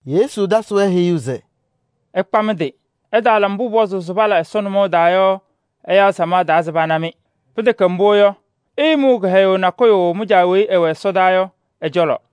Yesu tasɩ-wɛ heyuu se: “Ɩkpa mɩ-tɩ! Ɩtaala mbʋ pʋpɔzʋʋ se pala Ɛsɔ nʋmɔʋ taa yɔ ɛyaa samaɣ taa se pana-mɩ. Pɩtɛkɛ mbʋ, ɩɩmʋʋ kɩhɛyʋʋ nakʋyʋ mɩ-Caa weyi ɛwɛ ɛsɔdaa yɔ ɛ-cɔlɔ.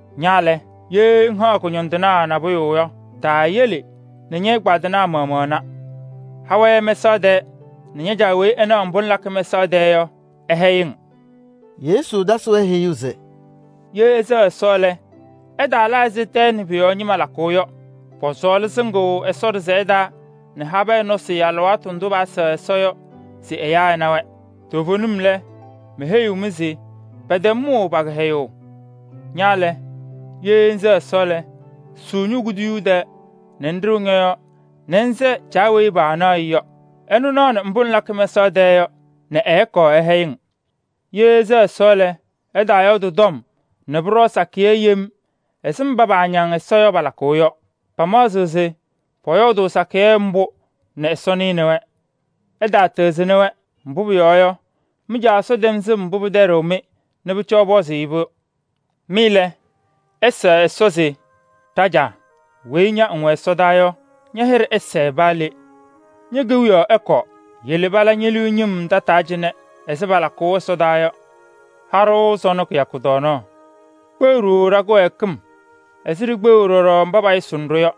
Ña lɛ, ye ŋhaɣ kʋñɔndɩnaa nabʋyʋ yɔ, taayele nɛ ñɛ-ɛgbaadɩnaa maɣmaɣ na. Ha-wɛ mɛsaɣ tɛɛ nɛ ña-Caa weyi ɛnaɣ mbʋ ŋlakɩ mɛsaɣ tɛɛ yɔ, ɛhɛyɩ-ŋ.” Yesu tasɩ-wɛ heyuu se: “Ye ɩsɛɣ Ɛsɔ lɛ, ɩtaala ɛzɩ tɛɛ nɛ pʋ-yɔɔ ñɩma lakʋʋ yɔ. Pɔsɔɔlɩ sɩŋʋʋ Ɛsɔ ɖɩsɛyɛ taa nɛ habɛɛ nɔsɩ alɩwaatʋ ndʋ pɛsɛɣ Ɛsɔ yɔ se ɛyaa ɛna-wɛ. Toovenim lɛ, meheyiɣ-mɩ se pɛtɛm pa-kɩhɛyʋʋ mʋʋ! Ña lɛ, ye ŋsɛɣ Ɛsɔ lɛ, ŋsʋʋ ño-kuduyuu tɛɛ nɛ ŋɖɩɣ ñɔ-yɔɔ nɛ ŋsɛɛ Caa weyi paanaɣ-ɩ yɔ. Ɛnʋ naɣnɩ mbʋ ŋlakɩ mɛsaɣ tɛɛ yɔ nɛ ɛkɔɔ ɛhɛyɩ-ŋ. “Ye ɩsɛɣ Ɛsɔ lɛ, ɩtaayɔɔdɩ tɔm nɛ pʋɖɔɔ sakɩyɛ yem ɛzɩ mba paañaŋ Ɛsɔ yɔ, palakʋʋ yɔ. Pamaɣzɩɣ se pɔyɔɔdʋʋ sakɩyɛ mbʋ nɛ Ɛsɔ nɩnɩ-wɛ. Ɩtaatɩɣzɩnɩ-wɛ, mbʋ pʋyɔɔ yɔ, mɩ-Caa Ɛsɔ tɛm sɩm mbʋ pɩtɛɖɩɣ-mɩ yɔ nɛ pʋcɔ ɩpɔzʋʋ-ɩ-pʋ. Mɩ lɛ, ɩsɛɛ Ɛsɔ se: ‘Ɖa-Caa weyi ña ŋwɛ ɛsɔdaa yɔ, ña-hɩɖɛ ɛsɛɛ paa le. Ñe-kewiyaɣ ɛkɔɔ, yele pala ñe-liu ñɩm tataa cɩnɛ ɛzɩ palakʋʋ ɛsɔdaa yɔ. Ha-ɖʋ sɔnɔ kɩyakʋ tɔɔnaɣ. Kpeɣ-ɖʋ ɖa-kɩwɛɛkɩm ɛzɩ ɖikpeɣu ɖɔɖɔ mba payʋsɩnɩ-ɖʋ yɔ.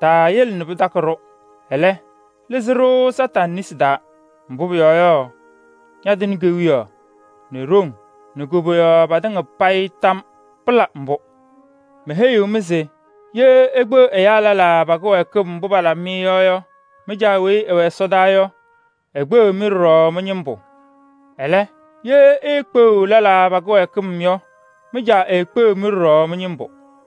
Taayele nɛ pɩtakɩ-ɖʋ, ɛlɛ, lɩzɩ-ɖʋ Kañadʋ Satanɩ nesi taa. [Mbʋ pʋyɔɔ yɔ, ñatɩnɩ kewiyaɣ nɛ ɖoŋ nɛ koboyaɣ patɩŋa payɩ tam yɔɔ. Pɩla mbʋ!]’ “Meheyiɣ-mɩ se: ye ikpeɣ ɛyaa lɛlaa pa-kɩwɛɛkɩm mbʋ palabɩ-mɩ yɔ yɔ, mɩ-Caa weyi ɛwɛ ɛsɔdaa yɔ, ekpeɣiɣ-mɩ ɖɔɖɔ mɩ-ñɩmbʋ. Ɛlɛ, ye iikpeɣiɣ lɛlaa pa-kɩwɛɛkɩm yɔ, mɩ-Caa eekpeɣiɣ-mɩ ɖɔɖɔ mɩ-ñɩmbʋ.”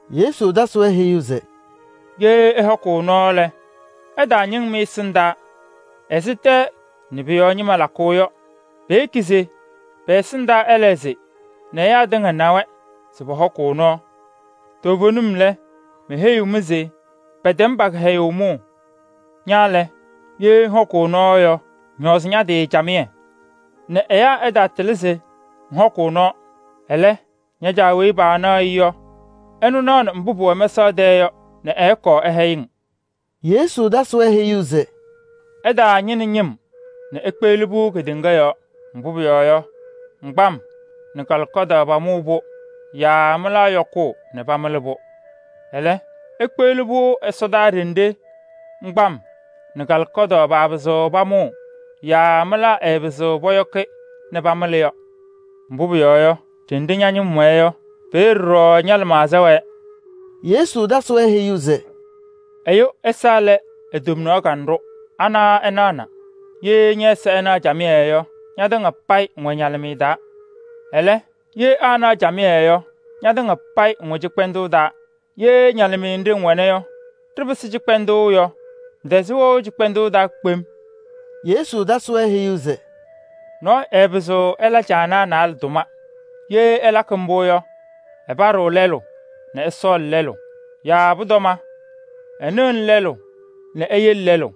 Yesu tasɩ-wɛ heyuu se: “Ye ɩhɔkʋʋ nɔɔ lɛ, ɩtaañɩŋ mɩ-ɛsɩndaa ɛzɩ tɛɛ nɛ pʋ-yɔɔ ñɩma lakʋʋ yɔ. Peyeki se pɛ-ɛsɩndaa ɛlɛɣzɩ nɛ ɛyaa tɩŋa na-wɛ se pɔhɔkʋʋ nɔɔ. Toovenim lɛ, meheyiɣ-mɩ se pɛtɛm pa-kɩhɛyʋʋ mʋʋ. Ña lɛ, ye ŋhɔkʋʋ nɔɔ lɛ, ŋñɔɔzɩ ña-tɩ camɩyɛ nɛ ɛyaa ɛtaatɩlɩ se ŋhɔkʋʋ nɔɔ. Ɛlɛ, ña-Caa weyi paanaɣ-ɩ yɔ, ɛnaɣnɩ mbʋ pʋwɛ mɛsaɣ tɛɛ yɔ nɛ ɛkɔɔ ɛhɛyɩ-ŋ.” Yesu tasɩ-wɛ heyuu se: “Ɩtaañɩnɩ ñɩm nɛ ikpeɣli-pʋ kedeŋa yɔɔ. Mbʋ pʋyɔɔ yɔ, ŋgbam nɛ kalɩkɔdaɣ pamʋʋ-pʋ yaa mɩlaa yɔkʋʋ nɛ pamɩlɩ-pʋ. Ɛlɛ, ikpeɣli-pʋ ɛsɔdaa ɖenɖe ŋgbam nɛ kalɩkɔdaɣ paapɩzɩɣ pamʋʋ yaa mɩlaa ɛɛpɩzɩɣ pɔyɔkɩ nɛ pamɩlɩ yɔ. Mbʋ pʋyɔɔ yɔ, ɖenɖe ña-ñɩm wɛɛ yɔ, peeye ɖɔɖɔ ña-lɩmaɣza wɛɛ.” Yesu tasɩ-wɛ heyuu se: “Ɛyʋ ɛza lɛ e-tomnaɣ kanɖʋ, ana ɛnaɣna. Ye ñɛ-ɛza ɛnaɣ camɩyɛ yɔ, ñatɩŋa payɩ ŋwɛ ñalɩmɩyɛ taa. Ɛlɛ, ye aanaɣ camɩyɛ yɔ, ñatɩŋa payɩ ŋwɛ cɩkpɛndʋʋ taa. Ye ñalɩmɩyɛ nɖɩ ŋwɛna yɔ, ɖɩpɩsɩ cɩkpɛndʋʋ yɔ, ŋtɛzɩɣ wɛʋ cɩkpɛndʋʋ taa kpem.” Yesu tasɩ-wɛ heyuu se: “Nɔɔyʋ ɛɛpɩzɩɣ ɛla caanaa naalɛ tʋma. Ye ɛlakɩ mbʋ yɔ, ɛpaɖɩɣ lɛlʋ nɛ ɛsɔɔlɩ lɛlʋ. Yaa pʋtɔma, ɛnɩɣnɩ lɛlʋ nɛ eyele lɛlʋ.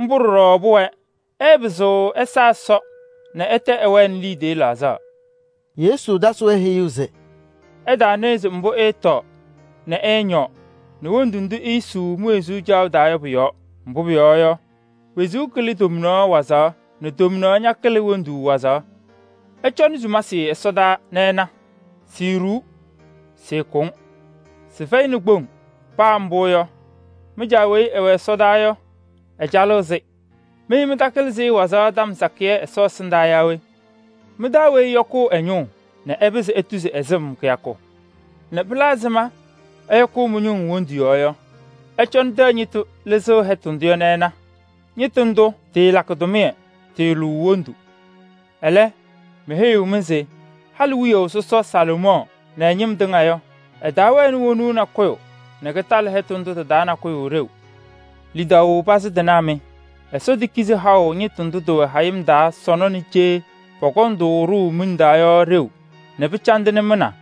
Mbʋ ɖɔɖɔ pʋwɛɛ: ɩɩpɩzɩɣ ɩsa Ɛsɔ nɛ ɩtɛ ɩwɛɛ liidiye laɣzaɣ.” Yesu tasɩ-wɛ heyuu se: “Ɩtaanɩɣzɩ mbʋ ɩɩtɔɔ nɛ ɩñɔɔ nɛ wondu ndʋ iisuu mi-wezuu caɣʋ taa yɔ pʋ-yɔɔ. Mbʋ pʋyɔɔ yɔ, wezuu kɩlɩ tɔɔnaɣ wazaɣ nɛ tomnaɣ ñakɩlɩ wondu wazaɣ. Ɩcɔnɩ sumasɩ ɛsɔdaa nɛ ɩna: siiɖuu, sɩɩkʋŋ. Sɩfɛyɩnɩ kpoŋ. Paa mbʋ yɔ, mɩ-Caa weyi ɛwɛ ɛsɔdaa yɔ, ɛcalɩɣ-sɩ. Mɩ mɩtakɩlɩ-sɩ wazaɣ tɔm sakɩyɛ Ɛsɔ ɛsɩndaa yaa we? Mɩ-taa weyi ɛyɔkʋʋ ɛ-ñʋʋ nɛ ɛpɩzɩ etuzi ɛ-sɩm kɩyakʋ? Nɛ pɩla ɛzɩma ɩyɔkʋʋ mɩ-ñʋŋ wondu yɔɔ yɔ? Ɩcɔnɩ tɛyɛ ñɩtʋ lɩzɩɣ hɛtʋ ndʋ yɔ nɛ ɩna. Ñɩtʋ ndʋ tɩɩlakɩ tʋmɩyɛ, tɩɩlʋʋ wondu. Ɛlɛ, meheyiɣ-mɩ se halɩ wiyaʋ sɔsɔ Salomɔɔ nɛ ɛ-ñɩm tɩŋa yɔ, ɛtaawɛnɩ wonuu nakʋyʋ nɛ kɩtalɩ hɛtʋ ndʋ tɩ-taa nakʋyʋ ɖeu. Lidaʋ pazɩ tɩnaa mɩ! Ɛsɔ tekizi haʋ ñɩtʋ ndʋ tɩwɛ hayɩm taa sɔnɔ nɛ cee pɔkɔŋ-tʋ ɖʋʋ miŋ taa yɔ ɖeu nɛ pɩcandɩnɩ mɩ na?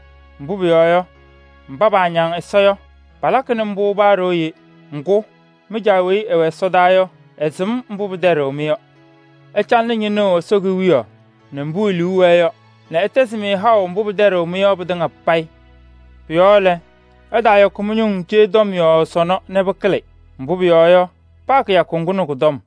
Mbʋ pʋyɔɔ yɔ, mba paañaŋ Ɛsɔ yɔ, palakɩnɩ mbʋ paa ɖooye. Ŋgʋ, mɩ-Caa weyi ɛwɛ ɛsɔdaa yɔ, ɛsɩm mbʋ pɩtɛɖɩɣ-mɩ yɔ. Ɩcalɩnɩ ñɩnʋʋ Ɛsɔ Kewiyaɣ nɛ ɛ-tʋʋzʋʋ nɛ ɛtɛzɩ-mɩ haʋ mbʋ pɩtɛɖɩɣ-mɩ yɔ pɩtɩŋa payɩ. Pʋ-yɔɔ lɛ, ɩtaayɔkɩ mɩ-ñʋŋ cee tɔm yɔɔ sɔnɔ nɛ pɩkɩlɩ. Mbʋ pʋyɔɔ yɔ, paa kɩyakʋ ŋgʋ nɛ kʋ-tɔm.”